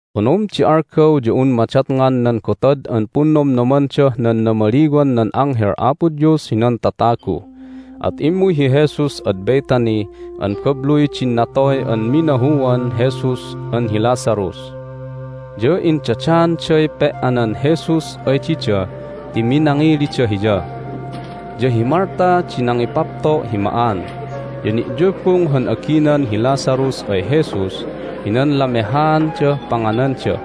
Onom di algaw ya un madatngan nan Gotad an Punnomnomandah nan Namaliwan nan Anghel Apo Dios hinan Tatagu, at immuy hi Jesus ad Bethany an babluy din natoy an minahuan Jesus an hi Lazarus. Ya indadaanday pe"anan Jesus ay dida ti minangilida Hiya, ya hi Martha di nangipapto' hi ma'an, ya ni'yubung han aginan hi Lazarus ay Jesus hinan lamehaandah pangananda.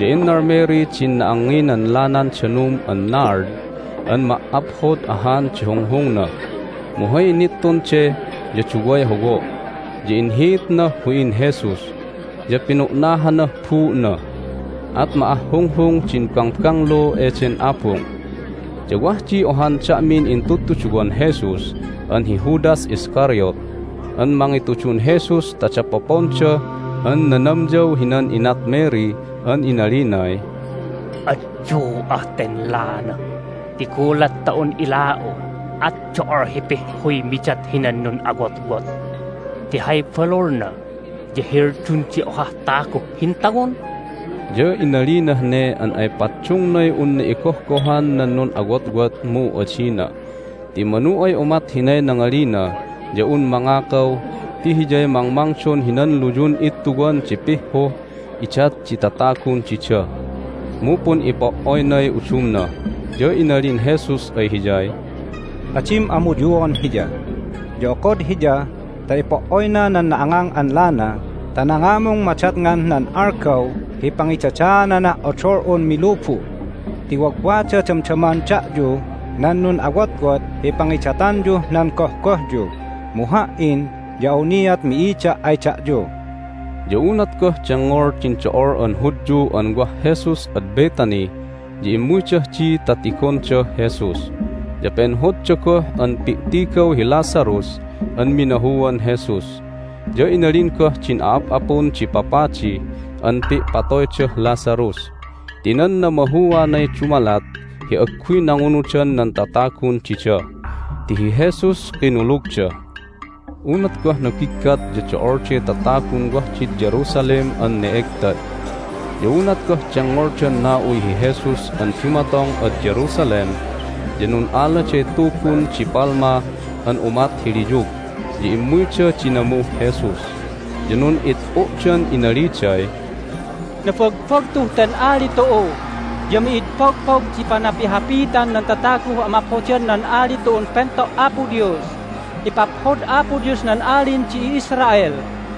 Ya innal Mary din na'angnginan lanan danum an nard an ma"aphod ahan di hunghungna, mu hay nittun de ya duway howo', ya inhiitnah hu'in Jesus, ya pinu'nahanah buu'na. At ma'ahhunghung din bangbanglu eden abung. Ya wah di ohan da'min intudtuduwan Jesus an hi Judas Iscariot an mangitudun Jesus ta dapoponda an nanamyaw hinan inat Mary an inalinay, "Adyu'ah ten lana ti gulat ta un ila'u at do'ol hi pihhuy midat hinan nun'awotwot! Ti hay balulna ya heldun di ohah taguh hintawon." Ya inalinah ne an ay paddungnay unna igohgohan nan nun'awotwot, mu adina, ti manu ay umat hinay nangalina ya un mangakaw ti hiyay mangmangdon hinan luyun ittuwan di pihhuh idat di tatagun dida, mu pun'ipo"oynay udumna. Ya inalin Jesus ay hiyay, "Adim amuyuan hiya! Ya okod hiya ta ipo"oyna nan na'angang an lana ta nangamung madatngan nan algaw hi pangidadaananah odol'un milubu'. Ti wagwada damdaman da'yu nan nun'awotwot hi pangidatanyuh nan gohgohyu, mu Ha"in ya awniat mi'ida' ay da'yu." Ya unat goh dengngol din do'ol an Hudyu an wah Jesus ad Bethany ya immuydah di ta tigondah Jesus, ya penhodda goh an pi'tigaw hi Lazarus an minahuan Jesus. Ya inalin goh din a'ap'apun di papadi an pi'patoydah Lazarus ti nan namahuanay dumalat hi agguy nangunudan nan tatagun dida, ti hi Jesus kinulugda. Unat goh nabiggat ya do'olday tatagun wah did Jerusalem an ne'egtad. Ya unat goh dengngoldan na'uy hi Jesus an dumatong ad Jerusalem ya nun'aladay tubun di palma an umat hi liyug, ya immuyda dinamuh Jesus. Ya nun'it'u'dan inaliday, "Nabagbagtuh ten Ali tu'u! Ya mi'id pogpog di panapihapitan nan tataguh amaphodan nan Ali tu'un Pento' Apo Dios! Ipaphod Apo Dios nan Alin di i'Israel!"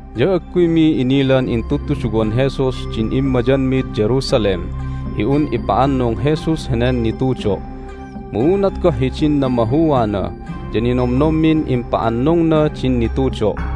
Ya agguymi inilan intudtuduwan Jesus din immayanmid Jerusalem hi un ipa'annung Jesus henen nitudo', mu unat goh hidin namahuana ya ninomnommin impa'annungna din nitudo'.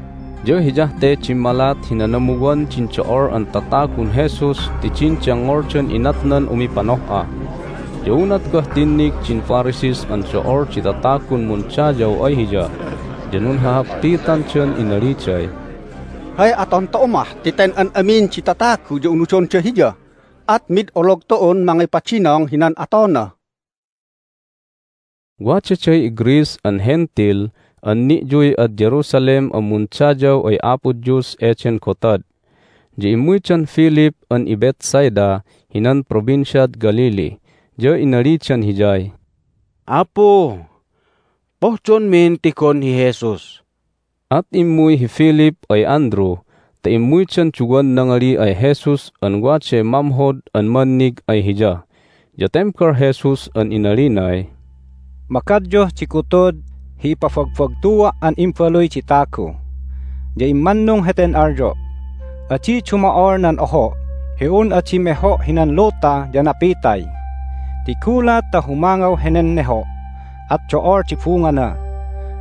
Ya hiyah te dimmalat hi nanamuwan din do'ol an tatagun Jesus ti din dengngoldan inatnan umipanoh'a. Ya unat goh tinnig din Pharisees an do'ol di tatagun mundayaw ay Hiya ya nunhahappitandan inaliday, "Hay aton tu'u mah? Ti ten an amin di tatagu ya unudonda Hiya, at mid olog tu'un mangipadinong hinan atona!" Wadaday iGreece an Hentil an ni'yuy ad Jerusalem an mundayaw ay Apo Dios eden gotad. Ya immuydan Philip an iBethsaida hinan Provinciad Galilee, ya inalidan hiyay, "Apu, pohdonmin tigon hi Jesus." At immuy hi Philip ay Andrew ta immuydan duwan nangali ay Jesus an waday mamhod an mannig ay Hiya. Ya tembal Jesus an inalinay, "Magadyuh di gutud hi ipabagbagtua' an Imbaluy di Tagu. Ya immannung heten alyo': adi dumo'ol nan oho' hi un adi meho' hinan luta ya napitay. Ti gulat ta humangaw henen neho' at do'ol di bungana.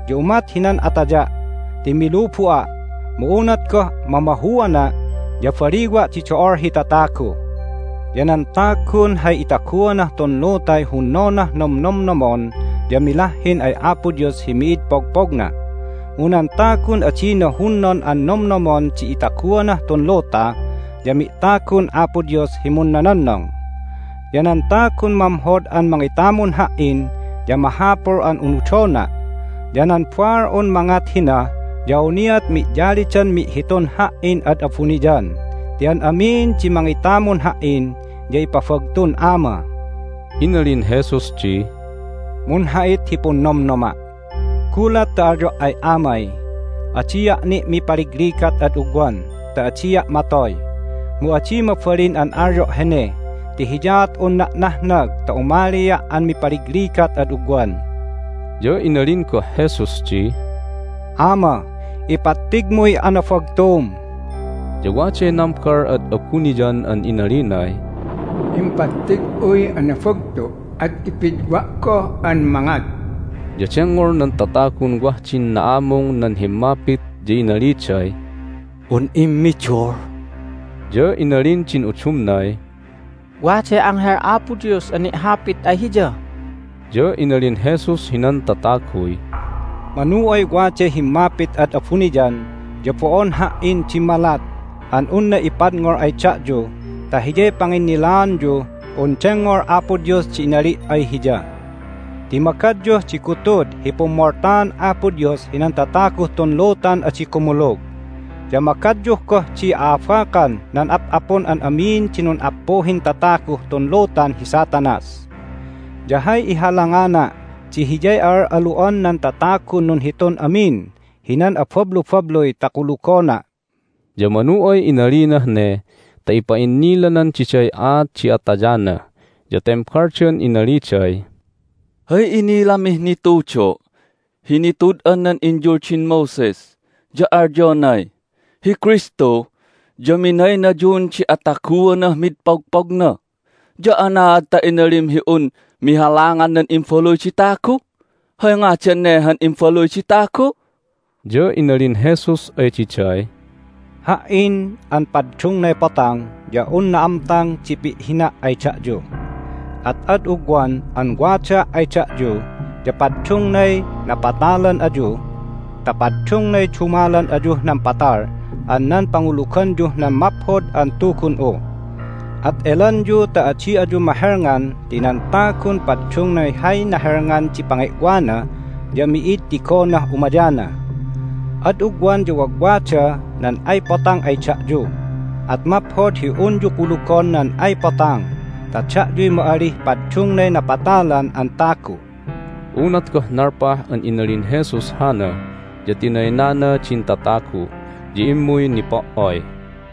Ya umat hinan ataya' ti milubu'a', mu unat goh mamahuana' ya baliwa' di do'ol hi tatagu. Ya nan tagun hay itaguanah tun lutay hunnonah nomnomnomon ya milahhin ay Apo Dios hi mi'id pogpogna, mu nan tagun adina hunnon an nomnomon di itaguanah tun luta ya mi'tagun Apo Dios hi munnononnong. Ya nan tagun mamhod an mangitamun Ha"in ya mahapul an unudona'. Ya nan baal'un mangat hina ya awniat mi'yalidan mi'hitun Ha"in ad abuniyan. Ti an amin di mangitamun Ha"in ya ipabagtun Ama." Inalin Jesus di, "Munha'it hi punnomnoma'! Gulat ta alyo' ay Amay, Adia' ni' mipaligligat ad ugwan ta adia' matoy! Mu adi mabalin an alyo' hene ti hiyaat unna' nahnag ta umalia' an mipaligligat ad ugwan." Ya inalin goh Jesus di, "Ama, ipattigmuy anabagtum!" Ya waday nambal ad abuniyan an inalinay, "Impattig'uy anabagtu', at ipidwa' goh an mangat." Ya dengngol nan tatagun wah din na'amung nan himmapit, ya inaliday, "Un immidul!" Ya inalin din udumnay, "Waday anghel Apo Dios an ni'hapit ay Hiya!" Ya inalin Jesus hinan tataguy, "Manu ay waday himmapit ad abuniyan ya bo'on Ha"in dimmalat an unna ipadngol ay da'yu ta hiyay panginnilaanyuh un dengngol Apo Dios di inali' ay Hiya. Ti magadyuh di gutud hi pummoltaan Apo Dios hinan tataguh tun lutan adi kumulug, ya magadyuh goh di a'abakan nan ap'apun an amin di nun'appuhin tataguh tun lutan hi Satanas. Ya hay ihalangana' di hiyay a'al'alu'an nan tatagun nunhitun amin hinan abablubabluy ta kulugona'." Ya manu ay inalinah ne ta ipa'innilanan diday aat di atayana. Ya tembaldan inaliday, "Hay inilamih nitudo' hi nitud'an nan inyuldin Moses ya alyonay, Hi Kristu ya minaynayun di ataguanah mid pogpogna. Ya anaad ta inalim hi un mihalangan nan Imbaluy di Tagu? Hay ngadan ne han Imbaluy di Tagu?" Ya inalin Jesus ay diday, "Ha"in an paddungnay Potang ya un na'amtang di pi'hina' ay da'yu. At ad ugwan an wadaa' ay da'yu ya paddungnay napatalan ayu ta paddungnay dumalan ayuh nan patal an nan panguluganyuh nan Maphod an Tugun'u. At elanyu ta adi ayu mahelngan ti nan tagun paddungnay hay nahelngan di pange'wana ya mi'id tigonah umayana. Ad ugwan ya wagwada nan ay Potang ay da'yu, at maphod hi unyu kulugon nan ay Potang ta da'yuy ma'alih paddungnay napatalan an tagu." Unat goh nalpah an inalin Jesus hana ya tinaynana din tatagu, ya immuy nipo"oy.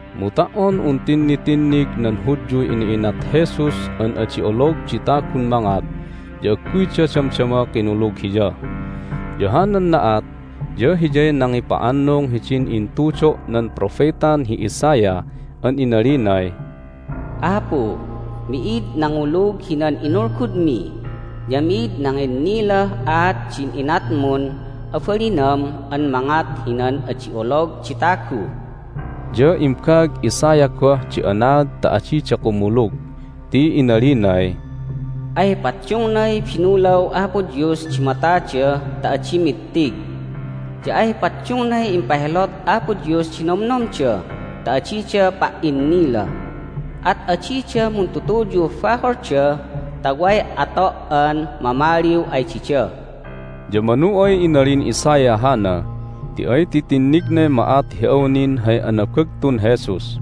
Mu ta"on un tinnitinnig nan Hudyuy ina'inat Jesus an adi olog di tagun mangat ya agguyda damdama kinulug Hiya. Ya hanan na'at ya hiyay nangipa'annung hidin intudo' nan propetan hi Isaiah an inalinay, "Apu, mi'id nangulug hinan inulgudmi, ya mi'id nanginnilah aat din inatmun abalinam an mangat hinan adi olog di tagu." Ya imbaag Isaiah goh di anaad ta adida kumulug, ti inalinay, "Ay paddungnay binulaw Apo Dios di matada ta adi mittig, ya ay paddungnay impahelot Apo Dios di nomnomda ta adida pa"innila. At adida muntutuyuh baholda ta way ato' an mamaliw ay dida." Ya manu ay inalin Isaiah hana ti ay titinnignay ma'at hi awnin hay anabagtun Jesus,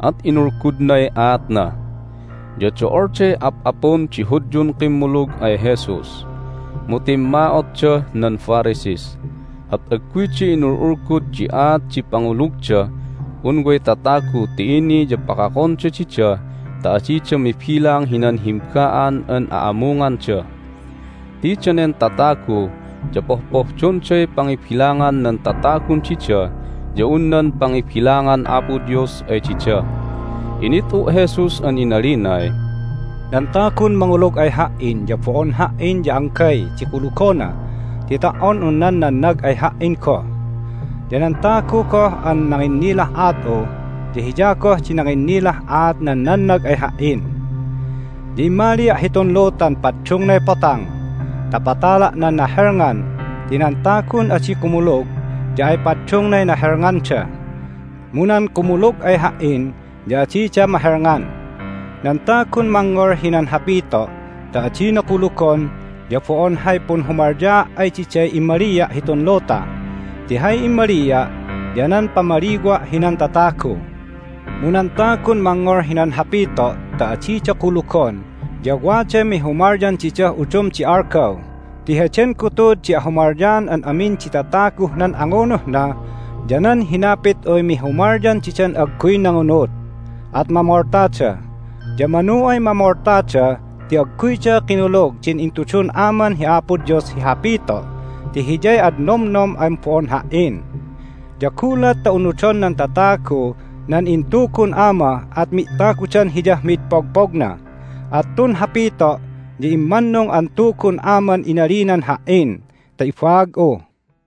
at inulgudnay aatna. Ya do'olday ap'apun di Hudyun kimmulug ay Jesus, mu timma'otdah nan Pharisees, at agguyda inul'ulgud di aat di pangulugdah un way tatagu ti ini ya pakakonda dida ta adida mibilang hinan himba'an an a'amunganda. Ti danen tatagu ya pohpohdonday pangibilangan nan tatagun dida ya un nan pangibilangan Apo Dios ay dida. Init'u' Jesus an inalinay, "Nan tagun mangulug ay Ha"in ya bo'on Ha"in ya anggay di kulugona ti ta"on un nan nannag ay Ha"in goh! Ya nan tagu goh an nanginnilah aat'u ya hiya goh di nanginnilah aat nan nannag ay Ha"in. Ya immalia' hitun lutan paddungnay Potang ta patala' nan nahelngan ti nan tagun adi kumulug ya ay paddungnay nahelnganda. Mu nan kumulug ay Ha"in ya adida mahelngan. Nan tagun mangngol hinan hapito' ta adina kulugon ya bo'on hay punhumalyaa' ay diday immalia' hitun luta, ti hay immalia' ya nan pamaliwa' hinan tatagu. Mu nan tagun mangngol hinan hapito' ta adida kulugon ya waday mihumalyan didah udum di algaw. Ti heden gutud di ahumalyaan an amin di tataguh nan angunuhna ya nan hinapit'uy mihumalyan didan agguy nangunud, at mamoltada. Ya manu ay mamoltada ti agguyda kinulug din intudun Aman hi Apo Dios hi hapito' ti Hiyay ad nomnom an bo'on Ha"in. Ya gulat ta unudon nan tatagu nan intugun Ama at mi'tagudan Hiyah mi'id pogpogna. At tun hapito' ya immannung an Tugun Aman inalinan Ha"in ta ibaag'u."